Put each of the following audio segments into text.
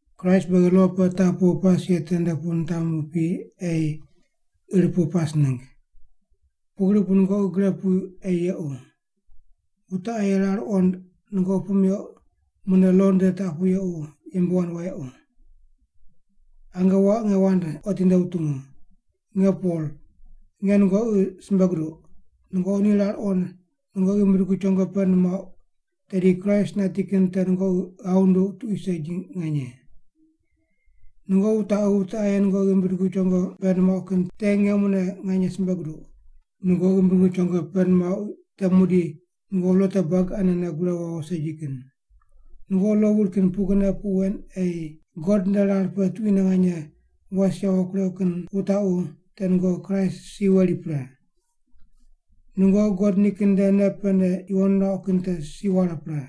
Kraist beghi lo pe taq pu pas ye tende pu nitamu pi ei ir pu pas ningg. Pugri bu nungoqi gre pu ei yequ. Wute aye rar wuqond nungoqi puq meuq mune lo nde taq pu yequ yembe wand wayequ. Ange waq nge wand otinde wutungu. Nge Pol, nge nungoqi simbe guduq, nungoqi ni rar wuqond nungoqi ghimbi dugu chongo pend muauq, tedi Kraist nati kin te nungoqi ghav wunduq tuqui segi nganye. Nungoqi wutaqu wute aye nungoqi ghimbi dugu chongo pend muauq kin te nge mune nganye simbe guduq, nungoqi ghimbi dugu chongo pend muauq te muqdi nungoqi lo te buagi anene gure wawo segi kin. Nungoqi lo wuri kin pugrine puq wen ei God nde rar pe tuquine nganye was yawo kureuq kin wutaqu te nungoqi Kraist si weri pre. Nungoqi God nikin nde nei pene yuwon nuauq kin te si ware pre.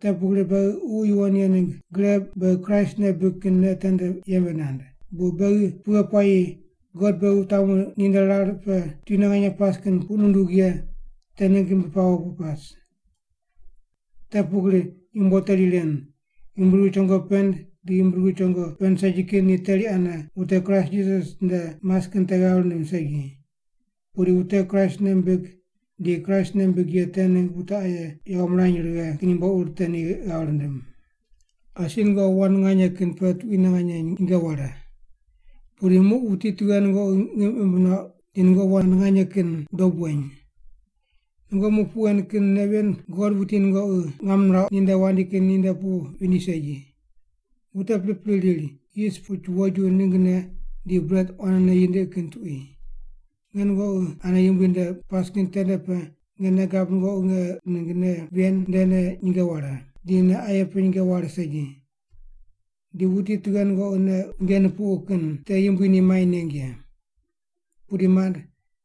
Te pugri beghi Ququ Yuwon Ye ningg gre beghi Kraist nei bibig kin nei tende yembe nand, bu beghi pughe puayi God beghi wutamu ninde rar pe tuquine nganye pas kin puq nundug ye te ningg ghimbi pawo pu pas. Te pugri yumbo teri ren, ghimbi dugu chongo pend di ghimbi dugu chongo pend segi kin ni teri ane wute Kraist Jisas nde mas kin te ghav rindim segi. Pudi wute Kraist nei mimbig di Kraist nei mimbig ye te ningg wute aye yawo mirany righe kin yumbo ur te ni ghav rindim. Asi nungoqi wand nganye kin pe tuquine nganye nyinge ware. Pudi muq wuti tughe nungoqi ngim imb nuauq di nungoqi wand nganye kin dob weny? Nungoqi muq puq wen kin nei ven God wuti nungoqi ngam nirauq ninde wandi kin ninde pu vindi segi. Wute pripri riri, yis puch woju ninggne di bret quanene yindiqi kin tuqui. Nge nungoqi ane Yumbui nde pas kin tende pe nge nei gab nungoqi nge ningg nei ven ndene nyinge ware, di nei aye pe nyinge ware segi. Di wuti tughe nungoqi nei unje nupuqu kin te Yumbui ni mai neng ye. Pudi, mand,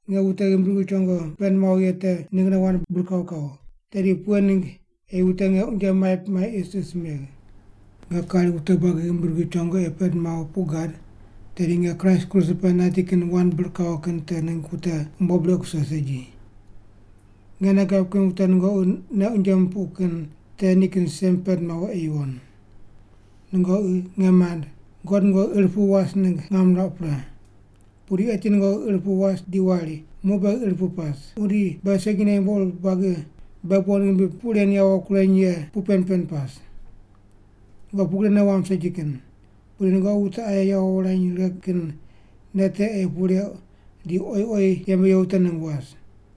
nge wute ghimbi dugu chongo pend mawo ye te ninggne wand bir kawo kawo, tedi pughe ningg ei wute nge unje maip mai isis megh? Nge kari wute buagi ghimbi dugu chongo ei pend mawo puq gad, tedi nge Kraist kruse pe nati kin wand bir kawo kin te ningg wute umbo brequ kuse segi. Nge nei gab kin wute nungoqi nei unje mupuq kin te nikin sem pend mawo ei yuwon. Nungoqi, nge mand, God nungoqi ir pu was ningg ngam nirauq pre. Pudi eti nungoqi ir pu was di wari, “Muq beghi ir pu pas, muqdi beghi segine yumbo ur buagi beghi bon ghimbi puq ren yawo kureny ye puq pen pen pas.” Nungoqi pugri nei wamb segi kin, pudi nungoqi wute aye yawo wurany righe kin nei te ei puq reuq di oyi oyi yembe ye wute ningg was.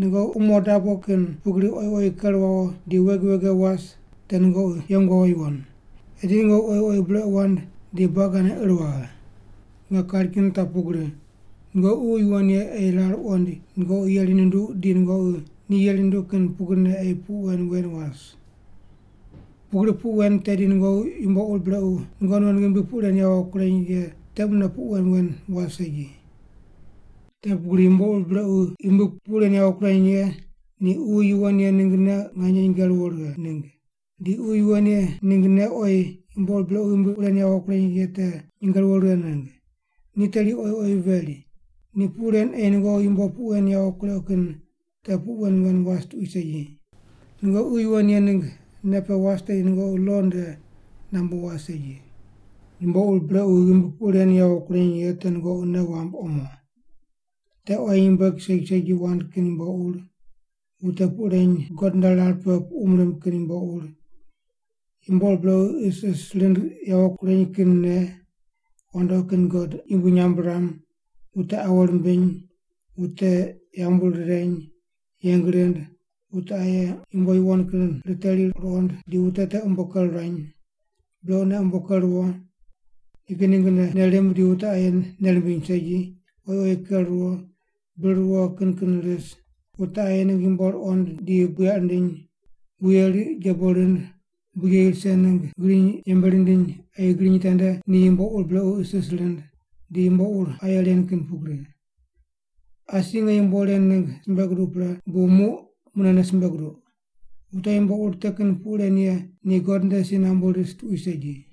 Nungoqi umo dabo kin pugri oyi oyi ker wawo di wege wege was, te nungoqi yeng wawo yuwon. Eti nungoqi oyi oyi brequ wand di buagi ane ir waghe. Nge kari kin taq pugri, nungoqi Ququ Yuwon Ye ei rar wuqoind nungoqi yeri nunduq di nungoqi ni yeri nunduq kin pugrine ei puq wen wen was. Pugri puq wen tedi nungoqi yumbo ur brequ nungoqi non ghimbi puq ren yawo kureny ye te mune puq wen wen was segi. Te pugri yumbo ur brequ ghimbi puq ren yawo kureny ye ni Ququ Yuwon Ye ningg nei nyinge ruwo righe ningg, di Ququ Yuwon Ye ningg nei ni oyi yumbo ur brequ ghimbi puq ren yawo kureny ye te nyinge ruwo righe ningg. Ni teri oyi oyi veri, ni puq ren ei nungoqi yumbo puq wen yawo kureuq kin te puq wen wen was tuqui segi. Nungoqi Ququ Yuwon Ye ningg nei pe was tedi nungoqi lo nde nambu was segi. Yumbo ur brequ ghimbi puq ren yawo kureny ye te nungoqi nei wamb omo. Te quayi nyumbueg segi segi wand kin yumbo ur, wute puq reny God nde rar pe puqum rimb kin yumbo ur, yumbo ur brequ isis rind yawo kureny kin nei, wandoqi kin god yumbui nyamb riram, wute awo rimbiny, wute yambu rireny, yeng rind, wute aye yumbo yuwon kin riteri ruqond di wute te umbo ker ruany, brequne umbo ker ruwo, nikin ninggne nei rimb di wute aye nei rimbiny segi, oyi oyi ker ruwo, bir ruwo kin kin ris, wute aye ningg yumbo ruqond di buyaq rindiny, wuye riq jebo rind, bujeyi rise ningg griny yembe rindiny ei griny tende ni yumbo ur brequ isis rind, di yumbo ur aye ren kin pugri. Asi nge yumbo ren ningg simbe guduq pre bu muq munene simbe guduq, wute yumbo ur te kin puq ren ye ni God nde si nambu ris tuqui segi.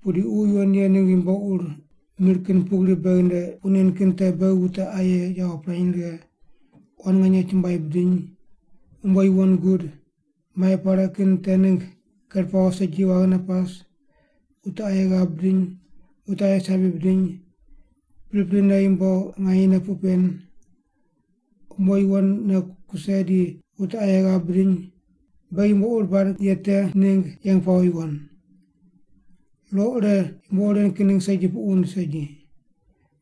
Pudi Ququ Yuwon Ye ningg yumbo ur mir kin pugri beghi nde puq nen kin te beghi wute aye yawo pirany righe, quan nganye chumbuai bidiny, umbo yuwon gud, mai pare kin te ningg ker pawo segi waghine pas, wute aye ghav bidiny, wute aye sabi bidiny, priprine yumbo nganyene puq pen, umbo yuwonne kuse di wute aye ghav bidiny, beghi yumbo ur bad ye te ningg yeng pawo yuwon. Lo ire yumbo ur ren kin ningg segi puq wund segi.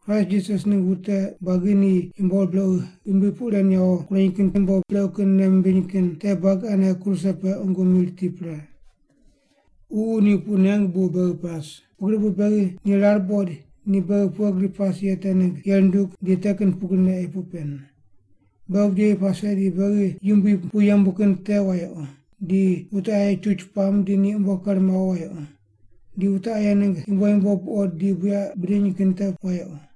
Kraist Jisas ningg wute buagi ni yumbo ur brequ ghimbi puq ren yawo kureny kin di yumbo brequ kin nei mimbiny kin te buagi ane kruse pe qungu mi riti pre. Ququ ni puq nengu bu beghi pas, pugri bu beghi ni rar buqoid ni beghi pughe gri pas ye te ningg yeri nundug di te kin pugrine ei puq pen. Beghi bujeyi pase di beghi yumbui pu yembu kin te wayequ, di wute aye chuch puam di ni umbo ker mawo wayequ, di wute aye ningg yumbo yumbo buqod di buyaq bidiny kin te wayequ.